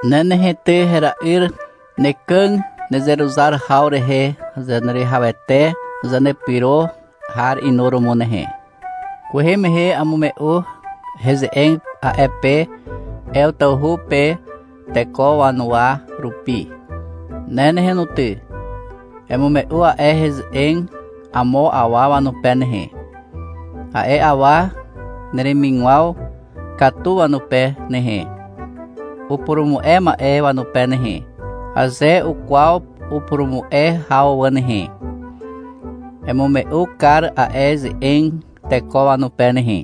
Ne nehe ty hera'yr, nekàg nezeruzar haw rehe Zaneruwihawete Zanepyro har inuromo nehe. Kwehe mehe amume'u heze'eg a'e pe Ew tawhu pe teko wanuwa rupi. Ne nehe no ty, emume'u a'e heze'eg amo awa wanupe nehe, a'e awa neremigwaw katu wanupe nehe, upurumu'e ma'e wanupe nehe, aze ukwaw upurumu'e haw wà nehe. Emume'u kar a'e ze'eg teko wanupe nehe.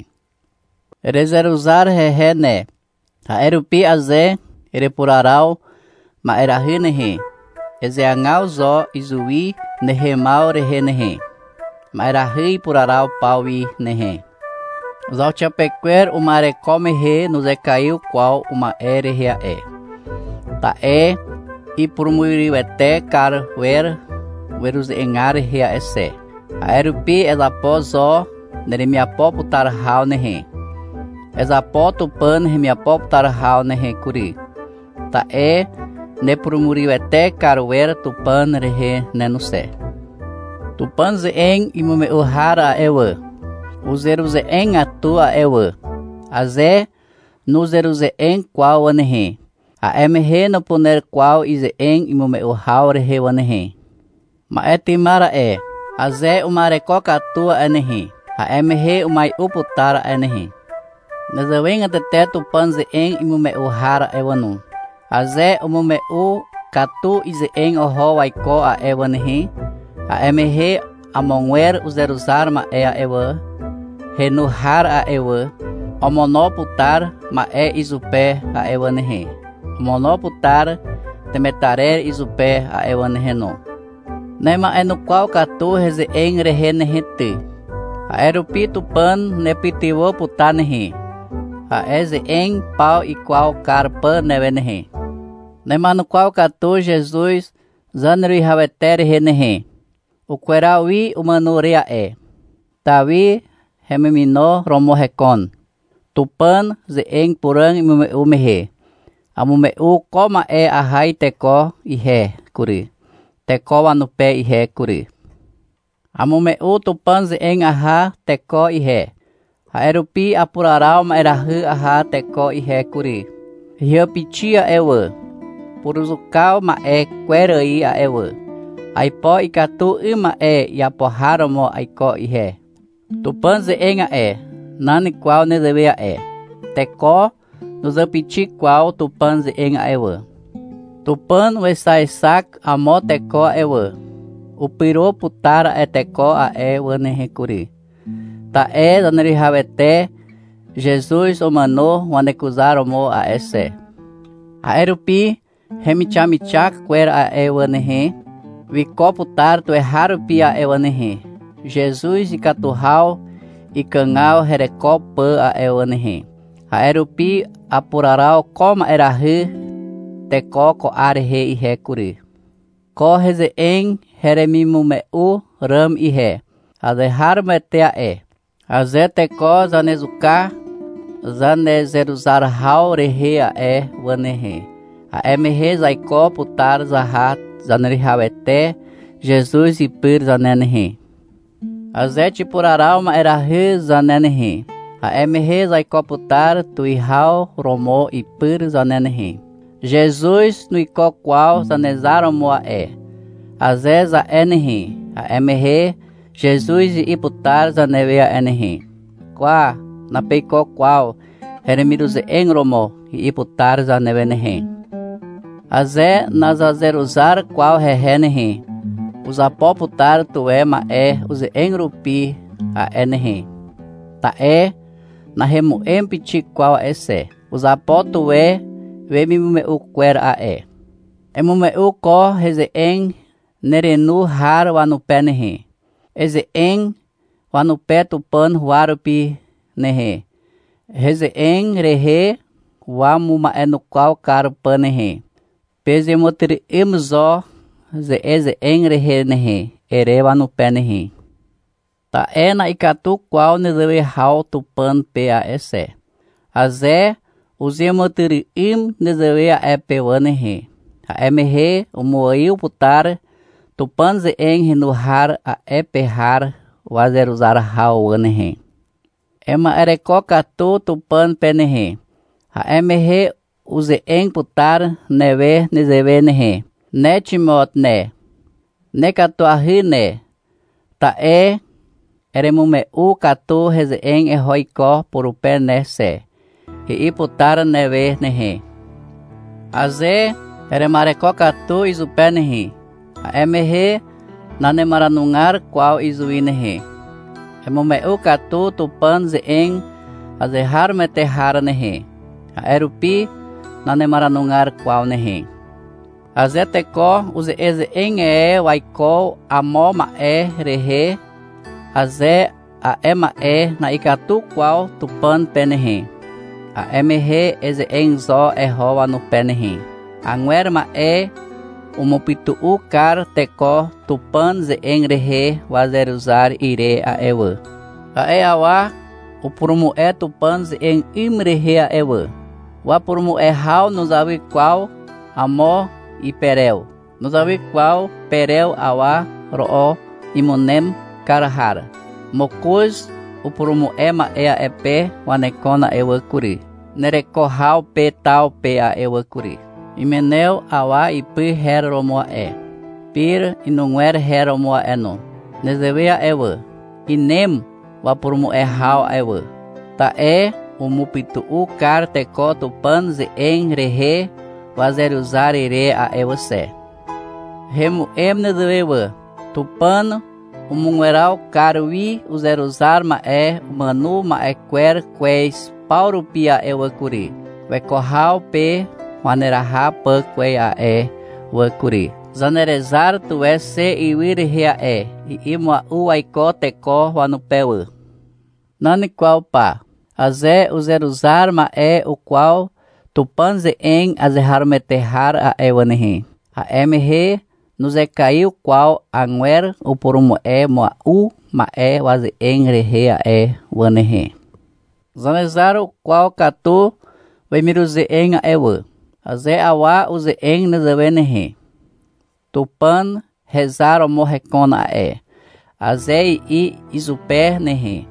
Erezeruzar hehe ne, a'e rupi aze erepuraraw ma'erahy nehe, ezeagaw zo izuwi nehemaw rehe nehe, ma'erahy ipuraraw paw wi nehe. Zauxiapekwer uma'ereko mehe nuzekaiw kwaw uma'e rehe a'e, ta'e ipurumurywete kar wer weruze'egar rehe a'e xe. A'e rupi ezapo zo neremiapo putar haw nehe. Ezapo Tupàn hemiapo putar haw nehe kury, ta'e nepurumurywete kar wer Tupàn rehe ne no xe. Tupàn ze'eg imume'u har a'e wà, uzeruze'egatu a'e wà. Aze nuzeruze'eg kwaw wà nehe, a'e mehe nupuner kwaw ize'eg imume'u haw rehe wà nehe. Ma'e tymar a'e, aze uma'ereko katu a'e nehe, a'e mehe umai'u putar a'e nehe. Nezewegatete Tupàn ze'eg imume'u har a'e wà no, aze umume'u katu ize'eg oho waiko a'e wà nehe, a'e mehe amogwer uzeruzar ma'e a'e wà, henu har a'e wà, omono putar ma'e izupe a'e wà nehe, omono putar temetarer izupe a'e wà nehe no. Nema'enukwaw katu heze'eg rehe nehe ty. A'e rupi Tupàn nepytywà putar nehe, a'e ze'eg paw ikwaw kar pà newe nehe. Nema'enukwaw katu Zezuz Zaneruwihawete rehe nehe. Ukweraw wi umàno re a'e. Tawi hemimino romo hekon. Tupàn ze'eg puràg imume'u mehe, amume'u ko ma'e aha iteko ihe kury, teko wanupe ihe kury. Amume'u Tupàn ze'eg aha teko ihe, a'e rupi apuraraw ma'erahy aha teko ihe kury. Heàpixi a'e wà, puruzuka ma'e kwer ài a'e wà. Aipo ikatu 'ym ma'e iapo har romo aiko ihe. Tupàn ze'eg a'e, nan kwaw nezewe a'e. Teko nuzàpixi kwaw Tupàn ze'eg a'e wà. Tupàn wexaexak amo teko a'e wà. Upyro putar a'e teko a'e wà nehe kury. Ta'e Zaneruwihawete Zezuz umàno wanekuzar romo a'e xe. A'e rupi hemixamixak kwer a'e wà nehe, wiko putar tuweharupi a'e wà nehe, Zezuz ikatu haw ikàgaw hereko pà a'e wà nehe. A'e rupi apuraraw ko ma'erahy teko ko 'ar rehe ihe kury. Ko heze'eg heremimume'u ràm ihe, azeharomoete a'e. — Aze teko zanezuka zanezeruzar haw rehe a'e wà nehe, a'e mehe zaiko putar zaha Zaneruwihawete Zezuz ipyr zane nehe. Aze xipuraraw ma'erahy zane nehe, a'e mehe zaiko putar tuwihaw romo ipyr zane nehe. — Zezuz nuiko kwaw Zanezar romo a'e, aze za'e nehe, a'e mehe Zezuz i'i putar zanewe a'e nehe, — Kwa, napeiko kwaw heremiruze'eg romo, i'i putar zanewe nehe. Aze nazazeruzar kwaw hehe nehe, uzapo putar tuwe ma'e uze'eg rupi a'e nehe. Ta'e nahemu'em pixik kwaw a'e xe. Uzapo tuwe wemimume'u kwer a'e. Emume'u ko heze'eg nerenu har wanupe nehe. Eze'eg wanupe Tupàn huwa rupi nehe, heze'eg rehe wamuma'enukwaw kar pà nehe. — Pezeàmàtyry'ym zo ze'eze'eg rehe nehe, ere wanupe nehe. Ta'e na'ikatu kwaw nezewe haw Tupàn pe a'e xe. Aze uzeàmàtyry'ym nezewe a'e pe wà nehe, a'e mehe umuaiw putar Tupàn ze'eg henu har a'e pe har wazeruzar haw wà nehe. Ema'ereko katu Tupàn pe nehe. A'e mehe uze'eg putar newe nezewe nehe. — Ne Ximot ne, nekatuahy ne, ta'e eremume'u katu heze'eg eho iko purupe ne xe, i'i putar newe nehe. Aze erema'ereko katu izupe nehe, a'e mehe nanemaranugar kwaw izuwi nehe. — Emume'u katu Tupàn ze'eg azeharomoete har nehe. A'e rupi nanemaranugar kwaw nehe. Aze teko uze'eze'eg e waiko amo ma'e rehe, aze a'e ma'e na'ikatu kwaw Tupàn pe nehe, a'e mehe eze'eg zo eho wanupe nehe. Agwer ma'e umupytu'u kar teko Tupàn ze'eg rehe wazeruzar ire a'e wà. A'e awa upurumu'e Tupàn ze'eg 'ym rehe a'e wà. Wapurumu'e haw nuzawy kwaw amo iperew. Nuzawy kwaw perew awa ro'o imunem kar har. Mokoz upurumu'e ma'e a'e pe wanekon a'e wà kury, nereko haw pe taw pe a'e wà kury. Imenew awa ipy her romo a'e. Pire inugwer her romo a'e no. Nezewe a'e wà. Inem wapurumu'e haw a'e wà. Ta'e umupytu'u kar teko Tupàn ze'eg rehe wazeruzar ire a'e wà xe. Hemu'em nezewe wà. — Tupàn umugweraw kar wi uzeruzar ma'e umàno ma'e kwer kwez paw rupi a'e wà kury, weko haw pe waneraha pà kwez a'e wà kury. Zanerezar tuwe xe ywy rehe a'e, i'i mua'u waiko teko wanupe wà. Nan kwaw pa, aze uzeruzar ma'e ukwaw Tupàn ze'eg azeharomoete har a'e wà nehe, a'e mehe nuzekaiw kwaw agwer upurumu'e mua'u ma'e waze'eg rehe a'e wà nehe. Zanezar ukwaw katu wemiruze'eg a'e wà. Aze awa uze'eg nezewe nehe, — Tupàn hezar romo hekon a'e, aze i'i izupe nehe,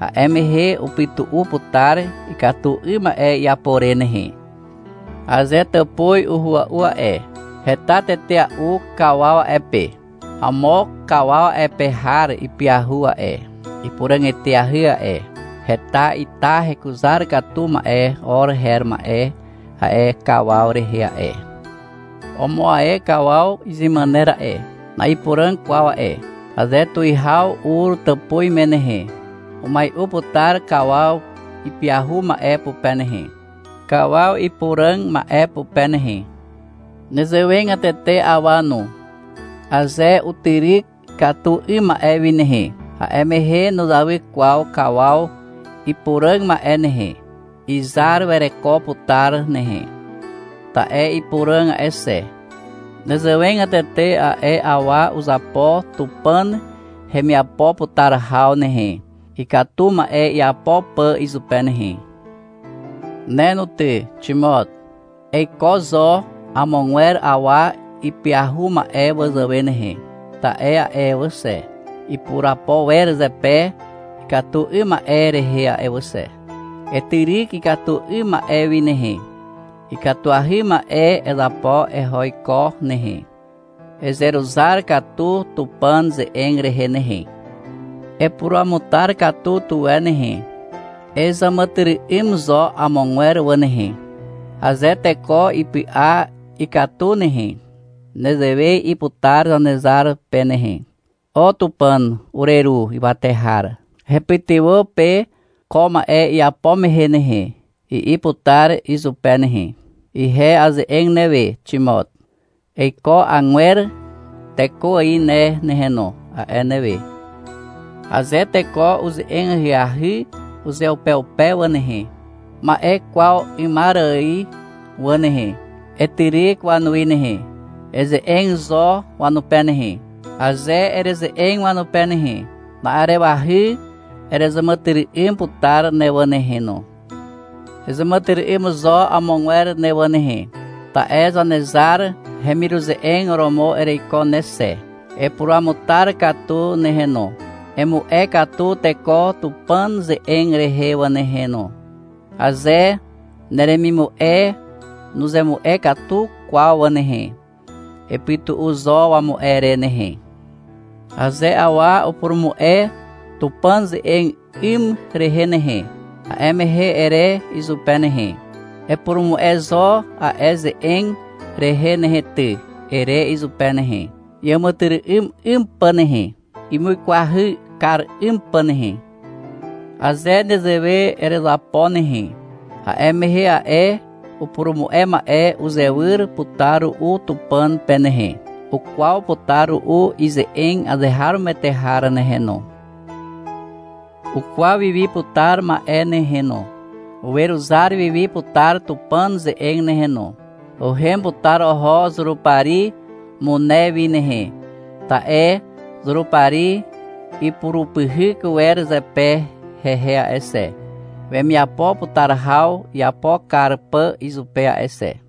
a'e mehe upytu'u putar ikatu 'ym ma'e iapo re nehe. Aze tàpuz uhua'u a'e, heta tetea'u kawaw a'e pe. Amo kawaw a'e pe har ipyahu a'e, ipuràg eteahy a'e. Heta ita hekuzar katu ma'e or her ma'e a'e kawaw rehe a'e. Omo ae kawaw izemàner a'e, na'ipuràg kwaw a'e. Aze tuwihaw ur tàpuz me nehe, umai'u putar kawaw ipyahu ma'e pupe nehe, kawaw ipuràg ma'e pupe nehe. Nezewegatete awa no, aze utyryk ikatu 'ym ma'e wi nehe, a'e mehe nuzawy kwaw kawaw ipuràg ma'e nehe. Izar wereko putar nehe, ta'e ipuràg a'e xe. Nezewegatete a'e awa uzapo Tupàn hemiapo putar haw nehe, ikatu ma'e iapo pà izupe nehe. Ne no ty, Ximot. Eiko zo amogwer awa ipyahu ma'e wazàwe nehe, ta'e a'e wà xe, ipurapo wer zepe ikatu 'ym ma'e rehe a'e wà xe. Etyryk ikatu 'ym ma'e wi nehe. Ikatuahy ma'e ezapo eho iko nehe. Ezeruzar katu Tupàn ze'eg rehe nehe. Epuruamutar katu tuwe nehe. Ezàmàtyry'ym zo amogwer wà nehe. Aze teko ipy'a ikatu nehe, nezewe i'i putar Zanezar pe nehe. — O Tupàn ureru ywate har, hepytywà pe ko ma'e iapo mehe nehe, i'i putar izupe nehe. Ihe aze'eg newe, Ximot. — Eiko agwer teko ài ne nehe no, a'e newe. Aze teko uze'eg ahyahy uzeupeupe wà nehe, ma'e kwaw 'ymar ài wà nehe, etyryk wanuwi nehe. Eze'eg zo wanupe nehe. Aze ereze'eg wanupe nehe, na'arewahy erezàmàtyry'ym putar ne wà nehe no. Ezàmàtyry'ym zo amogwer ne wà nehe, ta'e Zanezar hemiruze'eg romo ereiko ne xe. Epuruamutar katu nehe no. Emu'e katu teko Tupàn ze'eg rehe ne wà nehe no. Aze neremimu'e nuzemu'e katu kwaw wà nehe, epytu'u zo wamu'e re nehe. Aze awa upurumu'e Tupàn ze'eg 'ym rehe nehe, a'e mehe ere izupe nehe, — Epurumu'e zo a'e ze'eg rehe nehe ty, ere izupe nehe, iàmàtyry'ym 'ym pà nehe, imuikwahy kar 'ym pà nehe. Aze nezewe erezapo nehe, a'e mehe a'e upurumu'e ma'e uzewyr putar ru'u Tupàn pe nehe. Ukwaw putar ru'u ize'eg azeharomoete har nehe no. Ukwaw wiwi putar ma'e nehe no. Weruzar wiwi putar Tupàn ze'eg nehe no. Uhem putar oho Zurupari mune wi nehe, ta'e Zurupari ipurupyhyk wer zepe hehe a'e xe, wemiapo putar haw iapo kar pà izupe a'e xe.